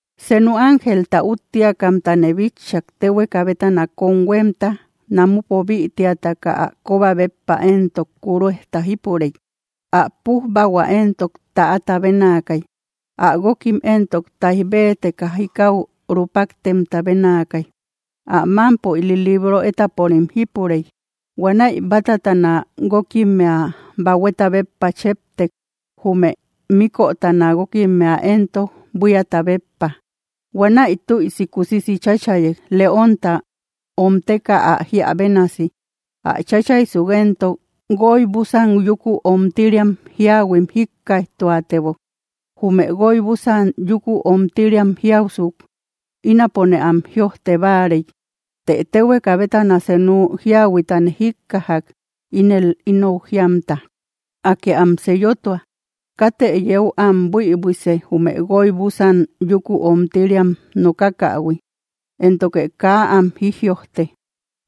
Senu ángelta úttiakamtane bitchak, téhueka bétana kómhuémta namupo bïtiataka ä kóba béppa éntok, kuruejta jípurey. Ä pújbahua éntok täata bénaakay. Ä guókim éntok táij béeteka jikau rúpaktemta bénaakay. Ä mámpo ili libro étaporim jípurey. Huanäi bátatana guókimmea bahueta béppa cheptek. Jume míkötana guókimmea éntok, buíata béppa. Huanäi tüisi kusisi cháchayek, leónta omteka ä jíä bénasi. Ä cháchaysuk éntok, guoy búsan yúku omtiriam jíahuim jíkkaijtuatebok. Jume guoy búsan yúku omtiriam jiausuk, ínapone am jïojte báarey. Të téhueka bétana senu jíahuitane jíkkajak, ínel ínou jíamta: —¡Akë am sellotua! ¡Katë yeu am buïbuise, jume guoy búsan yúku omtiriam nokakähui, éntoke kaa am jijïojte!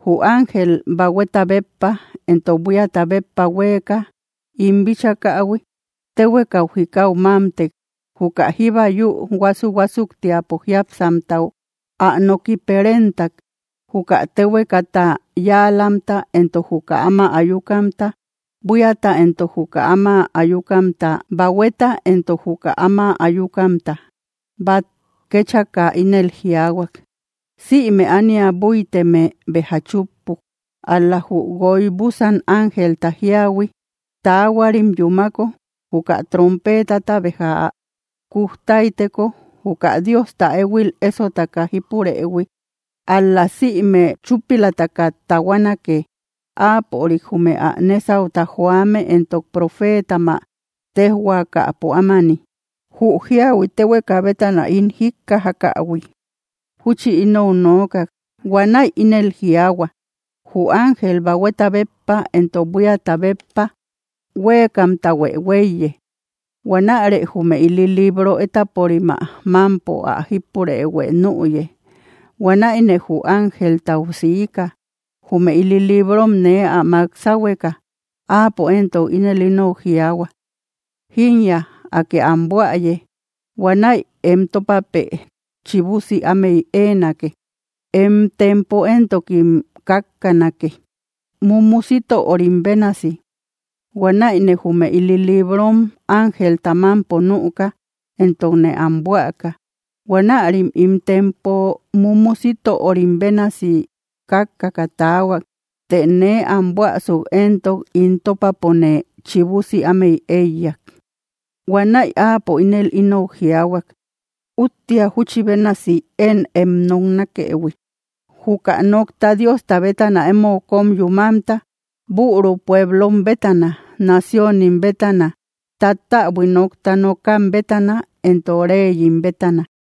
Jü ángel bahueta béppa entok buíata béppa huéeka im bíchakähui téhuekau jikau mámtek. Juka jíba yü huásu‑huásuktiapo jiápsamtau, ä noki perentak juka téhuekata yáalamta entok juka áma ayukamta, buíata entok juka áma ayukamta, bahueta entok juka áma ayukamta, bát kéchaka, ínel jiaahuak: —Sïme ánia búiteme béja chúppuk. Ál‑la jü guoy búsan ángelta jíahui taahuarim yúmako, juka trompeetata béja ä kuj táyteko, juka Diosta éhuil ésotaka jípurëhui ál‑la sïme chúpilataka tahuanake, áapörik jume ä nésauta joame éntok profeetam ä téjhuaakäpo ámani. Jü jíahui téhueka bétana ín jíkkajakähui júchi ínou nookak. Huanäi ínel jiaahua: —Jü ángel bahueta béppa entok buíata béppa huéekamtahuë huéiye. Huanärë jume ili libro étaporim ä mámpo ä jípurëhuë nüye. Huanäine jü ángeltau siika, jume ili librom nee ä mák sáhueka. Áapo éntok ínel ínou jiaahua: —Jínya, Akë am buäye. Huanäi em tópapë chibusi ámey éenake. Em tempo éntokim kákkanake, mumu sítörim bénasi. Huanäine jume ili librom ángelta mámpo nüka, entokne am buäka. Huanärim ín tempo mumu sítörim bénasi kákkaka taahuak. Të nee am buäsuk éntok ín tópapone chibusi ámey éiyak. Huanäi áapo ínel ínou jiaahuak: —Úttia júchi bénasi én em noknakëhui, juka nokta Diosta bétana emou kóm yúmamta, büru pueblom bétana, naciónim bétana, tattäbui nókta nokam bétana, entok reyim bétana.